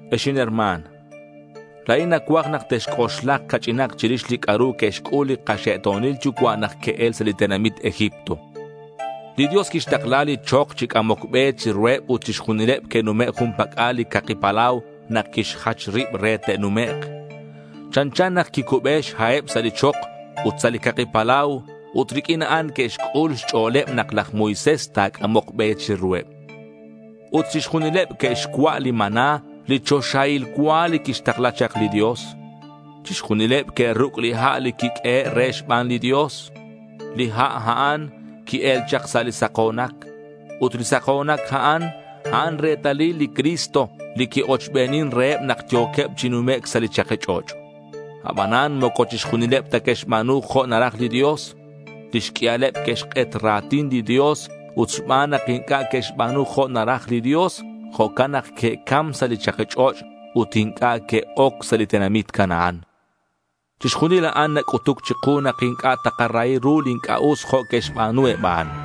Ex inherma̱n, la̱in nacuaj nak texc'oxlak ca'ch'inak chirix li c'a'ru que'xc'ul li kaxe'to̱nil yucua' nak que'el sa' li tenamit Egipto. Li Dios quixtakla li chok chi c'amoc be chiruheb ut chixjunileb que'nume' jun pac'al li Caki Palau nak quixjach rib re te'numek'. Chanchan nak que'cube xha'eb sa' li chok ut sa' li Caki Palau ut riq'uin a'an que'xc'ul xch'o̱leb nak laj Moisés ta̱c'amok be chiruheb. Ut chixjunileb que'xcua' li maná li choxahil cua li quixtakla chak li Dios. Chixjunileb que'ruc' li ha' li quiq'uehe' reheb xban li Dios. Li ha' a'an qui-el chak sa' li sako̱nac. Ut li sako̱nac a'an, a'an retalil li Cristo li qui-ochbenin reheb nak yo̱queb chi numec' sa' li chaki ch'och'. Abanan moco chixjunileb ta que'xba̱nu jo' naraj li Dios. Lix q'uialeb que'xk'et ra̱tin li Dios ut xban nak inc'a' que'xba̱nu jo' naraj li Dios, jo'can nak que'cam sa' li chaki ch'och' ut inc'a' que'oc sa' li tenamit Canaán. Chixjunil a'an nac'utuc chiku nak inc'a' takarahi ru li inc'a' us jo' que'xba̱nu eb a'an.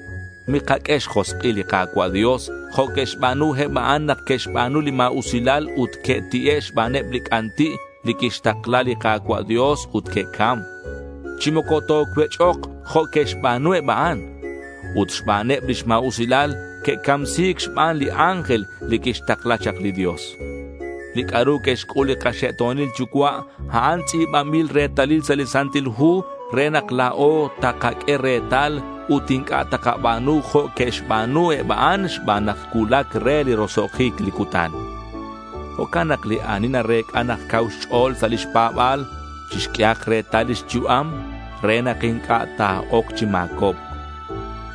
Mikaq'ue xjosk'il li Ka̱cua' Dios jo' que'xba̱nu eb a'an nak que'xba̱nu li ma̱usilal ut que'ti'e' xbaneb li c'anti' li quixtakla li Ka̱cua' Dios ut que'cam. Chi moco tocuech'ok, jo' que'xba̱nu eb a'an. Ut xbaneb lix ma̱usilal que'camsi̱c xban li ángel li quixtakla chak li Dios. Li c'a'ru que'xc'ul li kaxe'to̱nil yucua' a'an tz'i̱banbil retalil sa' li Santil Hu re nak la̱o takaq'ue retal ut inc'a' takaba̱nu jo' que'xba̱nu eb a'an xban nak cuulac re li roso'jic li cutan. Jo'can nak li ani narec'a nak cau xch'o̱l sa' lix pa̱ba̱l chixq'uehak retal lix yu'am re nak inc'a' ta̱oc chi ma̱cobc.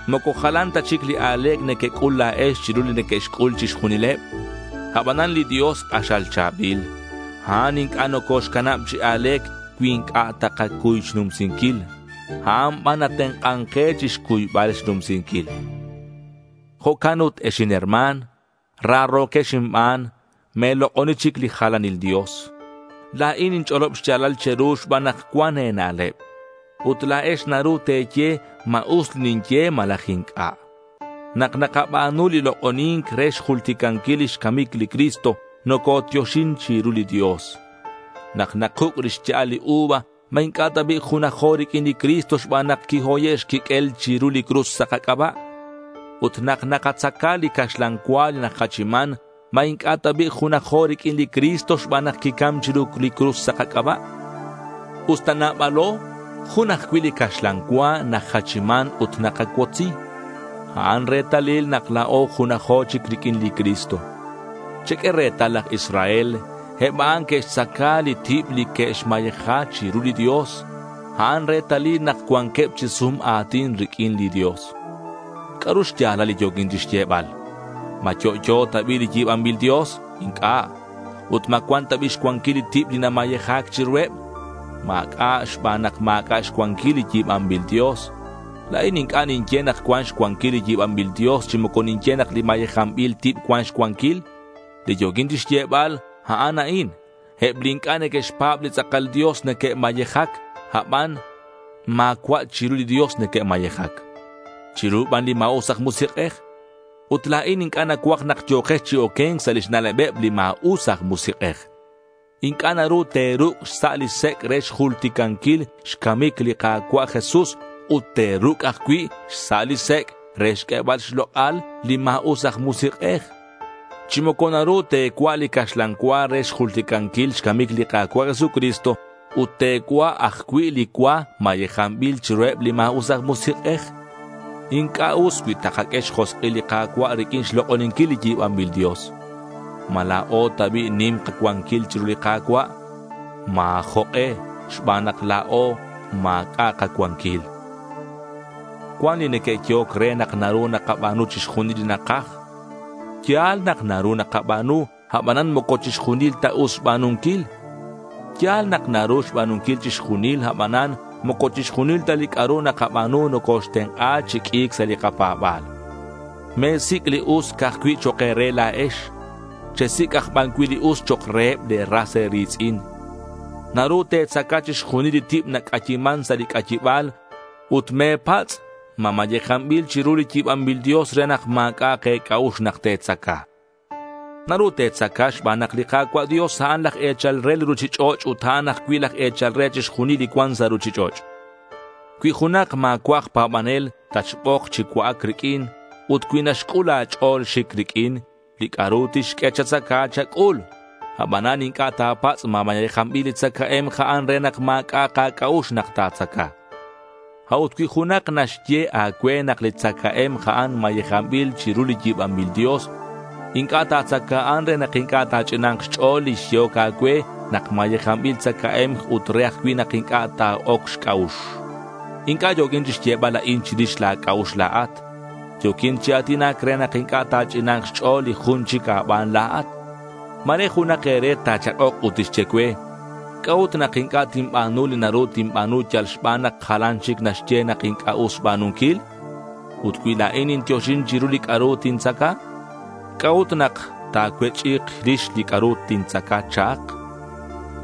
Moco jalan ta chic li a̱le̱c nequec'ul la̱ex chiru li neque'xc'ul chixjunileb. Abanan li Dios ti̱c xch'o̱l. A'an inc'a' nocoxcanab chi a̱le̱c cui inc'a' takacuy xnumsinquil. A'an ban natenk'an ke chixcuybal xnumsinquil. Jo'can ut ex inherma̱n, raro̱quex inban, me̱lok'oni chic li jalanil dios. La̱in ninch'olob xya̱lal che̱ru xban nak cuan e̱na'leb. Ut la̱ex naru te̱ye ma us li ninye malaj inc'a'. Nak nakaba̱nu li lok'oni̱nc re xjulticanquil lix camic li Cristo, nocotioxin chiru li Dios. Nak nakuc' li xya'al li uva, ¿ma inc'a' ta bi' junajo riq'uin li Cristo xban nak quihoye' xquiq'uel chiru li cruz sa' kac'aba'? Ut nak nakatzaca li caxlan cua li najachiman, ¿ma inc'a' ta bi' junajo riq'uin li Cristo xban nak quicam chiru li cruz sa' kac'aba'? Usta nabalo, jun ajcui' li caxlan cua najachiman ut nakacuotzi. A'an retalil nak la̱o junajo chic riq'uin li Cristo. Cheq'ue retal laj Israel. Eb a'an que'xtzaca li tib li que'xmayeja chiru li Dios. A'an retalil nak cuanqueb chi sum a̱tin riq'uin li Dios. ¿C'a'ru xya̱lal li yo̱quin chixyebal? ¿Ma yo'yo ta bi' li yi̱banbil dios? Inc'a'. Ut, ¿ma cuan ta bi' xcuanquil li tib li namayeja̱c chiruheb? Ma̱c'a' xban nak ma̱c'a' xcuanquil li yi̱banbil dios. La̱in inc'a' ninye nak cuan xcuanquil li yi̱banbil dios, chi moco ninye nak li mayejanbil tib cuan xcuanquil. Li yo̱quin chixyebal, a'an a'in: eb li inc'a' neque'xpa̱b li tz'akal Dios neque'mayejac, aban ma̱cua' chiru li Dios neque'mayejac. Chiru ban li ma̱us aj musik'ej. Ut la̱in inc'a' nacuaj nak yo̱kex chi oque̱nc sa' lix na'lebeb li ma̱us aj musik'ej. Inc'a' naru te̱ruc' xsa' li sec' re xjulticanquil xcamic li Ka̱cua' Jesús, ut te̱ruc' ajcui' xsa' li sec' re xq'uebal xlok'al li ma̱us aj musik'ej. Chi moco naru te̱cua' li caxlan cua re xjulticanquil xcamic li Ka̱cua' Jesucristo ut te̱cua' ajcui' li cua mayejanbil chiruheb li ma̱us aj musik'ej. Inc'a' us cui takaq'ue xjosk'il li Ka̱cua' riq'uin xlok'oninquil li yi̱banbil dios. ¿Ma la̱o ta bi' nim kacuanquil chiru li Ka̱cua'? Ma̱ jok'e xban nak la̱o ma̱c'a' kacuanquil. Cuan li neque'yehoc re nak naru nakaba̱nu chixjunil li nakaj. Ya̱l nak naru nakaba̱nu, abanan moco chixjunil ta us xba̱nunquil. Ya̱l nak naru xba̱nunquil chixjunil, abanan moco chixjunil ta li c'a'ru nakaba̱nu nocoxtenk'a chi q'ui̱c sa' li kapa̱ba̱l. Me̱sic' li us ca'aj cui' chok' e̱re la̱ex. Chesic' aj ban cui' li us chok' reheb le̱ ras e̱ri̱tz'in. Naru te̱tzaca chixjunil li tib nac'ayiman sa' li c'ayiba̱l, ut me̱patz' ma mayejanbil chiru li yi̱banbil dios re nak ma̱c'a'ak e̱c'a'ux nak te̱tzaca. Naru te̱tzaca xban nak li Ka̱cua' Dios a'an laj e̱chal re li ruchich'och' ut a'an ajcui' laj e̱chal re chixjunil li cuan sa' ruchich'och'. Cui junak ma̱cua' aj pa̱banel tatxbok chi cua'ac riq'uin ut cui naxc'ul a̱ch'o̱l xic riq'uin, li c'a'ru tixq'ue chatzaca, chac'ul. Abanan inc'a' ta̱patz' ma mayejanbil li tzacae̱mk a'an re nak ma̱c'a'ak a̱c'a'ux nak ta̱tzaca. A'ut cui junak naxye a̱cue nak li tzacae̱mk a'an mayejanbil chiru li yi̱banbil dios, inc'a' ta̱tzaca a'an re nak inc'a' ta̱ch'ina̱k xch'o̱l li xyehoc a̱cue nak mayejanbil tzacae̱mk ut re ajcui' nak inc'a' ta̱oc xc'a'ux. Inc'a' yo̱quin chixyebal a'in chirix la̱ c'a'ux la̱at. Yo̱quin chi a̱tinac re nak inc'a' ta̱ch'ina̱nk xch'o̱l li jun chic a̱ban la̱at. Ma̱re junak e̱re ta̱chak'ok ut tixye cue, ¿c'a'ut nak inc'a' tinba̱nu li naru tinba̱nu yal xban nak jalan chic naxye nak inc'a' us xba̱nunquil? Ut cui la̱in nintioxin chirix li c'a'ru nintzaca, ¿c'a'ut nak ta̱cuech'i̱k rix li c'a'ru tintzaca? cha'ak.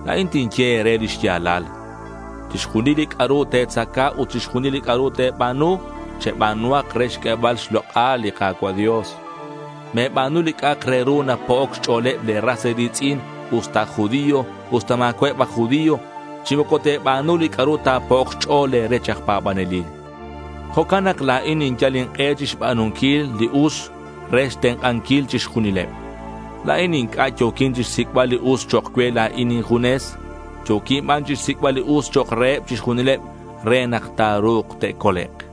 La̱in tinye e̱re li xya̱lal. Chixjunil li c'a'ru te̱tzaca ut chixjunil li c'a'ru te̱ba̱nu, cheba̱nuhak re xq'uebal xlok'al li Ka̱cua' Dios. Me̱ba̱nu li c'a'ak re ru napo'oc xch'o̱leb le̱ ras e̱ri̱tz'in usta aj judío, usta ma̱cua'eb aj judío. Chi moco te̱ba̱nu li c'a'ru ta̱po'ok xch'o̱l le̱ rech aj pa̱banelil. Jo'can nak la̱in ninyal ink'e chixba̱nunquil li us re xtenk'anquil chixjunileb. La̱in inc'a' yo̱quin chixsic'bal li us chok' cue la̱in injunes. Yo̱quin ban chixsic'bal li us chok' reheb chixjunileb re nak ta̱ru̱k te'colek'.